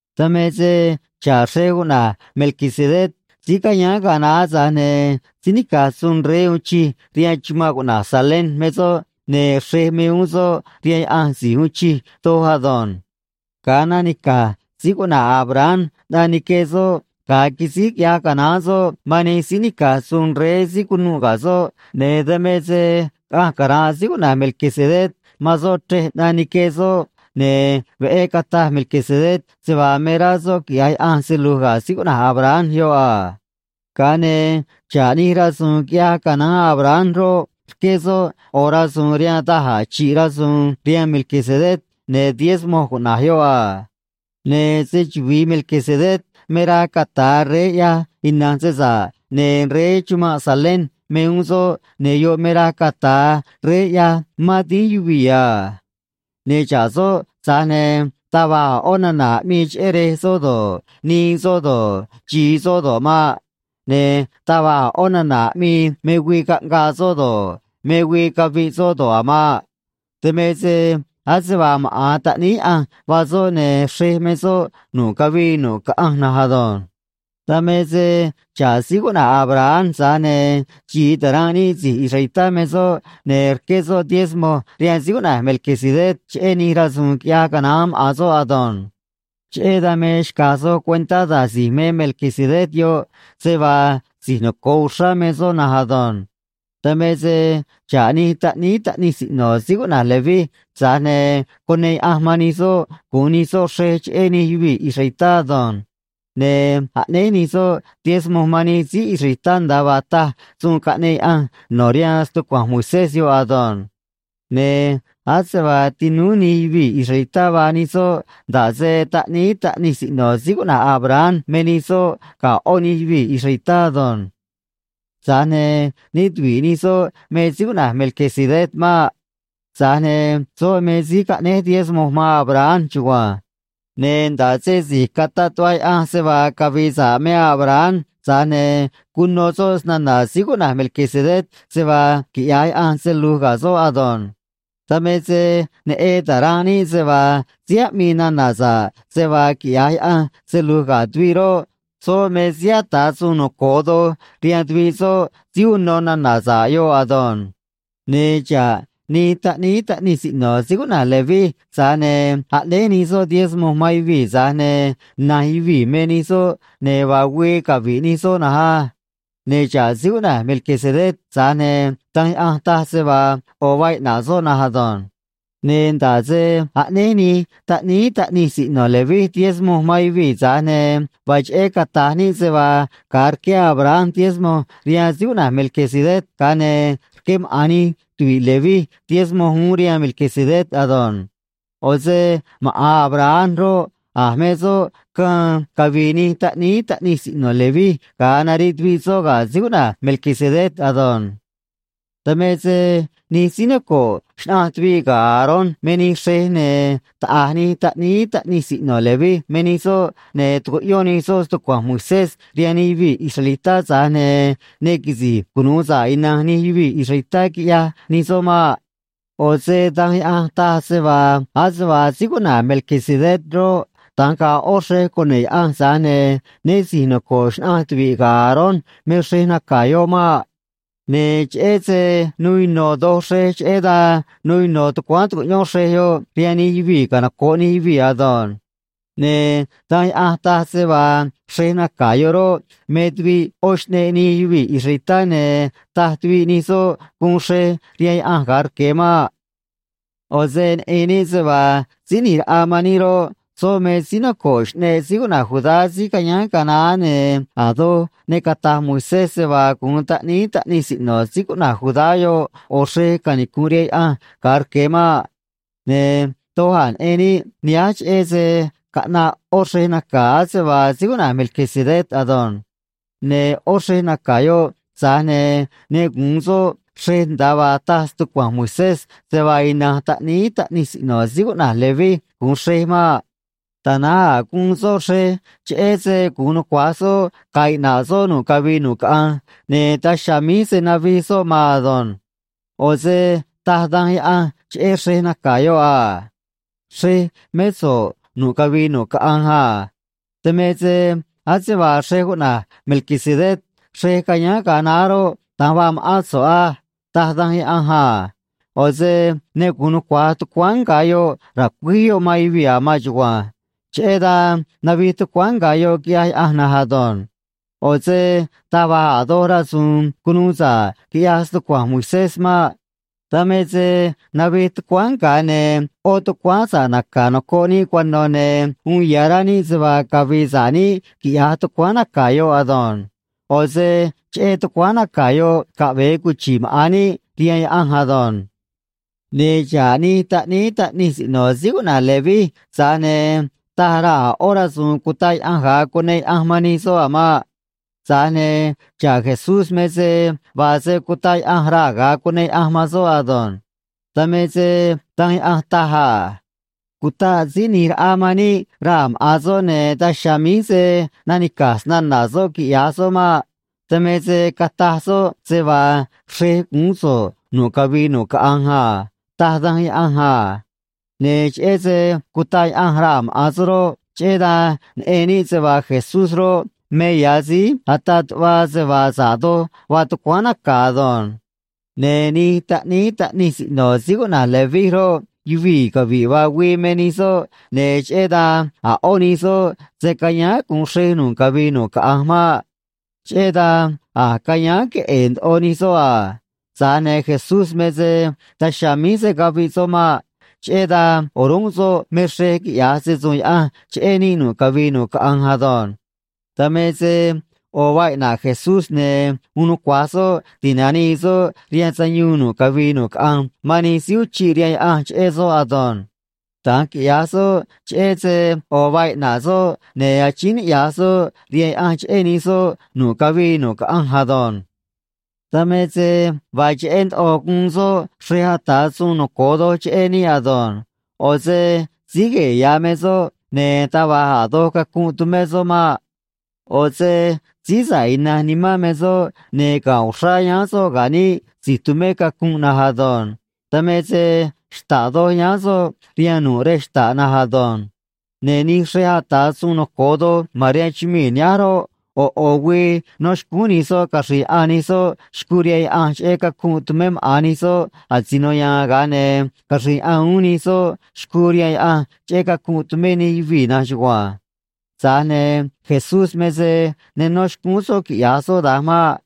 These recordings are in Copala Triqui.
Dan me se xa̱ꞌ xrej cuꞌna̱j Melquisedec, síí cayáán ga̱a naá, tza̱j ne̱ síí nica̱j suun rey uun chij rihaan chumanꞌ cuꞌna̱j Salem me soꞌ, ne̱ xrej me uún soꞌ rihaan Yaꞌanj Si̱j Uun Chij Doj ado̱nj. Ga̱a nanica̱j síí cuꞌna̱j Abraham ꞌnaꞌ nique soꞌ ga̱a quisíj quiꞌyaj canaán soꞌ man nij síí nica̱j suun rey síí cunuꞌ ga̱ soꞌ, ne̱ dan me se caꞌanj cara̱nꞌ síí cuꞌna̱j Melquisedec man soꞌ chrej ꞌnaꞌ nique soꞌ, ne̱ veꞌé cataj Melquisedec se vaa me rá soꞌ quiꞌya̱j Yaꞌanj se lu̱j ga̱ síí cuꞌna̱j Abraham yoꞌ a. Ga̱a ne̱ xa̱ꞌ nij rasu̱u̱n quiꞌyaj canaán Abraham roꞌ, rqué soꞌ ꞌo̱ rasu̱u̱n rihaan da̱j a̱ chi̱ꞌ rasu̱u̱n rihaan Melquisedec, ne̱ diezmo cuꞌna̱j yoꞌ a. Ne̱ se‑chuvi̱i Melquisedec me raj cata̱a rey ꞌyaj ina̱nj se sa̱ꞌ, ne̱ rey chumanꞌ Salem me uún soꞌ, ne̱ yoꞌ me raj cata̱a rey ꞌyaj mán dínj yuvii̱ a. Ne̱ xa̱ꞌ soꞌ, tza̱j ne̱ taj va̱j a̱ ꞌó nana̱ aꞌmii cheꞌé rej soꞌ do̱ꞌ, nii soꞌ do̱ꞌ, xi̱i soꞌ do̱ꞌ maꞌ. Ne̱ taj va̱j a̱ ꞌó nana̱ aꞌmii me güii caꞌngaa soꞌ do̱ꞌ, me güii caviꞌ soꞌ do̱ꞌ a̱ maꞌ. Dan me se ase vaa maꞌa̱n Taꞌníí Yaꞌanj vaa soꞌ, ne̱ xrej me soꞌ nu̱ꞌ cavii nu̱ꞌ caꞌanj na̱nj ado̱nj. Dan me se xa̱ꞌ síí cuꞌna̱j Abraham, tza̱j ne̱ xi̱i ta̱ranꞌ níꞌ si̱j israelitá me soꞌ, ne̱ rqué soꞌ diezmo rihaan síí cuꞌna̱j Melquisedec cheꞌé nij rasu̱u̱n quiꞌyaj canaán maꞌa̱n soꞌ ado̱nj. Cheꞌé dan me xca̱j soj cuentá da̱j si̱j me Melquisedec yoꞌ, se vaa si̱j noco̱o uxrá me soꞌ na̱nj ado̱nj. Dan me se xa̱ꞌ nij taꞌníí taꞌnij siꞌno̱ síí cuꞌna̱j Leví, tza̱j ne̱ cuneꞌ Yaꞌanj man nij soꞌ gu̱un nij soꞌ xrej cheꞌé nij yuvii̱ israelitá ado̱nj. Ne̱ aꞌnéj nij soꞌ diezmo man nij síí israelitá, nda̱a vaa taj suun caꞌneꞌ Yaꞌanj no̱ rihaan stucua̱nj Moisés yoꞌ ado̱nj. Ne̱ ase vaa tinúú nij yuvii̱ israelitá vaa nij soꞌ, nda̱ꞌ se taꞌníí taꞌnij siꞌno̱ síí cuꞌna̱j Abraham me nij soꞌ ga̱ ꞌó nij yuvii̱ israelitá ado̱nj. Tza̱j ne̱ né tuvi̱ꞌ nij soꞌ me síí cuꞌna̱j Melquisedec maꞌ. Tza̱j ne̱ soꞌ me síí caꞌnéj diezmo man Abraham chugua̱nj. Ne̱ nda̱ꞌ se si̱j cataꞌ tuꞌva Yaꞌanj se vaa cavi̱i̱ sa̱ꞌ me Abraham, tza̱j ne̱ cuno soꞌ snana̱ síí cuꞌna̱j Melquisedec se vaa quiꞌya̱j Yaꞌanj se lu̱j ga̱ soꞌ ado̱nj. Dan me se neꞌen ta̱ranꞌ níꞌ se vaa síí aꞌmii nana̱ sa̱ꞌ se vaa quiꞌya̱j Yaꞌanj se lu̱j ga̱ tuviꞌ roꞌ, soꞌ me síí ata̱ suun noco̱o doj rihaan tuviꞌ soꞌ síí uno nana̱ sa̱ꞌ yoꞌ ado̱nj. Ne̱ xa̱ꞌ nij taꞌníí taꞌnij siꞌno̱ síí cuꞌna̱j Leví, tza̱j ne̱ aꞌnéj nij soꞌ diezmo man yuvii̱, tza̱j ne̱ na̱nj yuvii̱ me nij soꞌ, ne̱ vaa güii cavi̱ꞌ nij soꞌ na̱nj á. Ne̱ xa̱ꞌ síí cuꞌna̱j Melquisedec, tza̱j ne̱ Danj Yaꞌanj taj se vaa ꞌo̱ vaa iꞌna̱ꞌ soꞌ na̱nj ado̱nj. Ne̱ nda̱ꞌ se aꞌnéj nij taꞌníí taꞌnij siꞌno̱ Leví diezmo man yuvii̱, tza̱j ne̱ vaa cheꞌé cata̱j níꞌ se vaa ga̱a rqué Abraham diezmo rihaan síí cuꞌna̱j Melquisedec, ga̱a ne̱ rqué maꞌa̱n nij tuvi̱ꞌ Leví diezmo uún rihaan Melquisedec ado̱nj. ꞌO̱ se maꞌa̱n Abraham roꞌ, a̱j me soꞌ caân cavi̱i̱ nij taꞌníí taꞌnij siꞌno̱ Leví ga̱a nariꞌ tuviꞌ soꞌ ga̱ síí cuꞌna̱j Melquisedec ado̱nj. Dan me se nij síí noco̱ꞌ xnaꞌanj tuvi̱ꞌ ga̱ Aarón me nij xrej, ne̱ taꞌa̱j nij taꞌníí taꞌnij siꞌno̱ Leví me nij soꞌ, ne̱ tucuꞌyón nij soꞌ stucua̱nj Moisés rihaan nij yuvii̱ israelitá, tza̱j ne̱ ne quisi̱j cunu̱u sa̱ꞌ ina̱nj nij yuvii̱ israelitá, quiꞌyaj nij soꞌ maꞌ. ꞌO̱ se Danj Yaꞌanj taj se vaa ase vaa síí cuꞌna̱j Melquisedec roꞌ, da̱nj ga̱a̱ ꞌó xrej cune̱ꞌ Yaꞌanj, tza̱j ne̱ né si̱j noco̱ꞌ xnaꞌanj tuviꞌ ga̱ Aarón me xrej naca̱ yoꞌ maꞌ. Ne̱ cheꞌé se nuu ino̱ doj xrej, cheꞌé dan nuu ino̱ tucuáán tu̱cuꞌyón xrej yoꞌ rihaan nij yuvii̱ canoco̱ꞌ nij yuvii̱ ado̱nj. Ne̱ Danj Yaꞌanj taj se vaa xrej naca̱ yoꞌ roꞌ, me tuviꞌ ꞌó xꞌneꞌ nij yuvii̱ israelitá, ne̱ taj tuviꞌ nij soꞌ guun xrej rihaan Yaꞌanj ga̱a rque̱ maꞌ. ꞌO̱ se neꞌen níꞌ se vaa Síí ꞌNi̱j Raꞌa man níꞌ roꞌ, soꞌ me síí noco̱ꞌ xꞌneꞌ síí cuꞌna̱j Judá, síí cayáán ga̱a naá, ne̱ a̱ doj ne cata̱j Moisés se vaa gu̱un taꞌníí taꞌnij siꞌno̱ síí cuꞌna̱j Judá yoꞌ ꞌo̱ xrej canicu̱nꞌ rihaan Yaꞌanj ga̱a rque̱ maꞌ. Ne̱ doj a̱ neꞌen níꞌ nihánj cheꞌé se caꞌnaꞌ ꞌó xrej naca̱ ase vaa síí cuꞌna̱j Melquisedec ado̱nj. Ne̱ ꞌó xrej naca̱ yoꞌ, tza̱j ne̱ ne gu̱un soꞌ xrej nda̱a vaa taj stucua̱nj Moisés se vaa ina̱nj taꞌníí taꞌnij siꞌno̱ síí cuꞌna̱j Leví gu̱un xrej maꞌ. Tana̱nj a̱ guun soꞌ xrej cheꞌé se gu̱un nucua̱j soꞌ ga̱a̱ iꞌna̱ꞌ soꞌ nu̱ꞌ cavii nu̱ꞌ caꞌanj, ne̱ daj chiha̱a̱ míj se̱ navij soꞌ maan ado̱nj. ꞌO̱ se taj Danj Yaꞌanj cheꞌé xrej naca̱ yoꞌ a: Xrej mé so̱ꞌ nu̱ꞌ cavii nu̱ꞌ caꞌanj a. Dan me se ase vaa xrej cuꞌna̱j Melquisedec xrej cayáán ga̱a naá roꞌ, da̱nj vaa ma̱ꞌán so̱ꞌ á, taj Danj Yaꞌanj a. ꞌO̱ se ne gu̱un nucua̱j tucuáán nga̱ yoꞌ ra̱cuíj yoꞌ man yuvii̱ a̱ maan chugua̱nj. Cheꞌé dan navij tucuáán nga̱ yoꞌ, quiꞌyaj Yaꞌanj na̱nj ado̱nj. ꞌO̱ se taj va̱j a̱ doj rasu̱u̱n cunuu sa̱ꞌ quiꞌyaj stucua̱nj Moisés maꞌ. Dan me se navij tucuáán nga̱, ne̱ ꞌó tucuáán sa̱ꞌ naca̱ nocoꞌ níꞌ cuano̱, ne̱ uun ya̱ rá níꞌ se vaa cavi̱i̱ sa̱ꞌ níꞌ, quiꞌya̱j tucuáán naca̱ yoꞌ ado̱nj. ꞌO̱ se cheꞌé tucuáán naca̱ yoꞌ caꞌve̱e cuchi̱ꞌ maꞌa̱n níꞌ rihaan Yaꞌanj ado̱nj. Ne̱ xa̱ꞌ nij taꞌníí taꞌnij siꞌno̱ síí cuꞌna̱j Leví, tza̱j ne̱ taj raa̱ a̱ ꞌó rasu̱u̱n cutaꞌ Yaꞌanj ga̱a cuneꞌ Yaꞌanj man nij soꞌ a̱ maꞌ. Tza̱j ne̱ xa̱ꞌ Jesús me se vaa se cutaꞌ Yaꞌanj raa̱ ga̱a cuneꞌ Yaꞌanj man soꞌ ado̱nj. Dan me se Danj Yaꞌanj taj a: Cutaꞌ Síí ꞌNi̱j Raꞌa man níꞌ raa̱ maꞌa̱n soꞌ, ne̱ daj chiha̱a̱ míj se̱ nanica̱j snana̱ soꞌ, quiꞌya̱j soꞌ maꞌ. Dan me se cataj soꞌ se vaa xrej guún so̱ꞌ nu̱ꞌ cavii nu̱ꞌ caꞌanj a, taj Danj Yaꞌanj a. Ne̱ cheꞌé se cutaꞌ Yaꞌanj raa̱ maꞌa̱n soꞌ roꞌ, cheꞌé dan neꞌen níꞌ se vaa Jesús roꞌ, me ya̱ síí ataꞌ tuꞌva se vaa sa̱ꞌ doj vaa tucuáán naca̱ ado̱nj. Ne̱ nij taꞌníí taꞌnij siꞌno̱ síí cuꞌna̱j Leví roꞌ, yuvii̱ cavi̱ꞌ vaa güii me nij soꞌ, ne̱ cheꞌé dan a̱ ꞌó nij soꞌ se̱ cayáán gu̱un xrej nu̱ꞌ cavii nu̱ꞌ caꞌanj maꞌ. Cheꞌé dan a̱j cayáán queꞌe̱e̱ ndoꞌo nij soꞌ a. Tza̱j ne̱ Jesús me se daj chiha̱a̱ míj se̱ caviꞌ soꞌ maꞌ. Cheꞌé dan o̱rúnꞌ soꞌ me xrej quiꞌya̱j se‑su̱u̱n Yaꞌanj cheꞌé níꞌ nu̱ꞌ cavii nu̱ꞌ caꞌanj ado̱nj. Dan me se ꞌo̱ vaa iꞌna̱ꞌ Jesús, ne̱ uun nucua̱j soꞌ ti̱nanii soꞌ rihaan sayuun nu̱ꞌ cavii nu̱ꞌ caꞌanj man nij síí uchiꞌ rihaan Yaꞌanj cheꞌé soꞌ ado̱nj. Da̱nj quiꞌya̱j soꞌ cheꞌé se ꞌo̱ vaa iꞌna̱ꞌ soꞌ, ne̱ achíín niꞌya̱j soꞌ rihaan Yaꞌanj cheꞌé nij soꞌ nu̱ꞌ cavii nu̱ꞌ caꞌanj ado̱nj. Dan me se vaa cheꞌé ndoꞌo guun soꞌ xrej ata̱ suun noco̱o doj cheꞌé níꞌ ado̱nj. ꞌO̱ se síí gue̱e̱ ya̱ me soꞌ, ne̱ taj va̱j a̱ doj cacunꞌ tumé soꞌ maꞌ. ꞌO̱ se síí sa̱ꞌ ina̱nj nimán me soꞌ, ne̱ ga̱nꞌ uxrá yáán soꞌ ga̱ níꞌ si̱j tumé cacunꞌ na̱nj ado̱nj. Dan me se xta̱ꞌ doj yáán soꞌ rihaan nu̱ꞌ rej xta̱ꞌ na̱nj ado̱nj. Ne̱ nij xrej ata̱ suun noco̱o doj ma̱n rihaan chumii̱ nihánj roꞌ, ꞌo̱ ꞌo̱ güii nó xcúún nij soꞌ caxri̱i̱ yaꞌan nij soꞌ xcuu rihaan Yaꞌanj cheꞌé cacunꞌ tumé maꞌa̱n nij soꞌ asino ya̱a̱n, ga̱a ne̱ caxri̱i̱ yaꞌan uún nij soꞌ xcuu rihaan Yaꞌanj cheꞌé cacunꞌ tumé nij yuvii̱ na̱nj chugua̱nj. Tza̱j ne̱ Jesús me se ne nó xcúún soꞌ quiꞌya̱j soꞌ da̱nj maꞌ.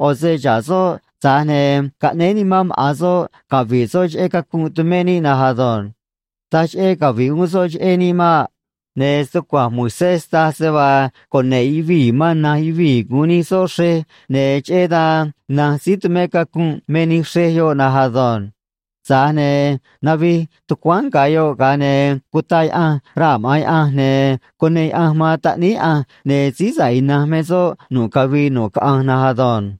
ꞌO̱ se xa̱ꞌ soꞌ, tza̱j ne̱ caꞌnéé nimán maꞌa̱n soꞌ cavi̱ꞌ soꞌ cheꞌé cacunꞌ tumé níꞌ na̱nj ado̱nj. Taj cheꞌé cavi̱ꞌ uún soꞌ cheꞌé níꞌ maꞌ. Ne̱ stucua̱nj Moisés taj se vaa cune̱ꞌ yuvii̱ man na̱nj yuvii̱ gu̱un nij soꞌ xrej, ne̱ cheꞌé dan na̱nj síí tumé cacunꞌ me nij xrej yoꞌ na̱nj ado̱nj. Tza̱j ne̱ navij tucuáán nga̱ yoꞌ, ga̱a ne̱ cutaꞌ Yaꞌanj raa̱ maꞌa̱n Yaꞌanj, ne̱ cuneꞌ Yaꞌanj man Taꞌníí Yaꞌanj, ne̱ síí sa̱ꞌ ina̱nj me soꞌ nu̱ꞌ cavii nu̱ꞌ caꞌanj na̱nj ado̱nj.